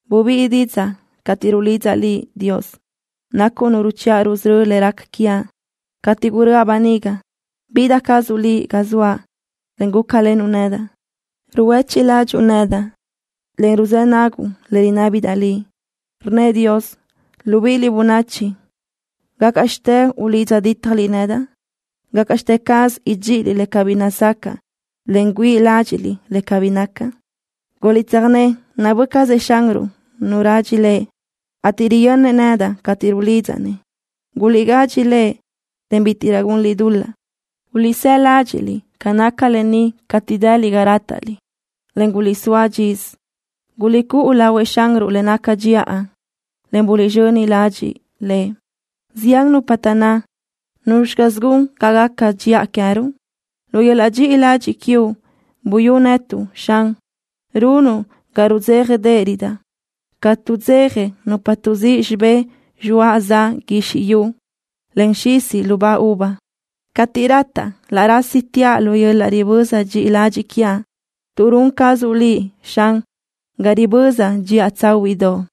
Bubíʼi didzaʼ cateʼ rulidzaʼ Liʼ, Dios. Nacuʼ Nu ruchiʼa rusörö́ le raca quiaʼ. Cateʼ guröʼa böniga, bida cazuʼ Liʼ ga zoaʼ, en gúcalenuʼ nedaʼ. Ruhuéchiʼ ladxiʼ nedaʼ, en ruzë́ naguʼ le rinábidaʼ Liʼ. Rnnëʼ Dios: “Libíʼiliʼ, bönachi, ¿gácaʼxte ulidza dítajliʼ nedaʼ? ¿Gácaʼxte caz idxíʼiliʼ le cabí nazacaʼ, en güíʼi ládxiʼliʼ le cabí naca?” Guliʼtsöjné nabö́ cazëʼ Xanruʼ nu radxi Lëʼ, ateʼ riyönnëʼ nedaʼ cateʼ rulidzaʼ-nëʼ. Guliʼgadxi Lëʼ, en bítiʼrö gunliʼ dul-laʼ. Guliʼsáʼ ladxiʼ ca naca lë ni cateʼ dëliʼ ga rátaʼliʼ, en guliʼsóa dxisö. Guliʼcúʼu lahuëʼ Xanruʼ le naca dxiʼa, en buliʼzxöni ladxiʼ Lëʼ. Zián nupa taʼnná: “¿Nuzxi caz gun ga gaca dxiʼa queë́ruʼ?” Lu yöl-laʼ dxiʼi ladxiʼ quiuʼ buyú netuʼ, Xan. Runuʼ ga rudzéjadeʼerödaʼ ca tuʼdzeja nupa tuʼzíʼ xibé zxoaʼ za guizxi yu, en xisi lubá uva. Cateʼ rataʼ, laʼ rásitiaʼ lu yöl-laʼ riböza dxi ladxiʼ quiaʼ, tuʼ run cazuʼ Liʼ, Xan, ga ribözaʼ dxiʼa tsáhuiʼdoʼ.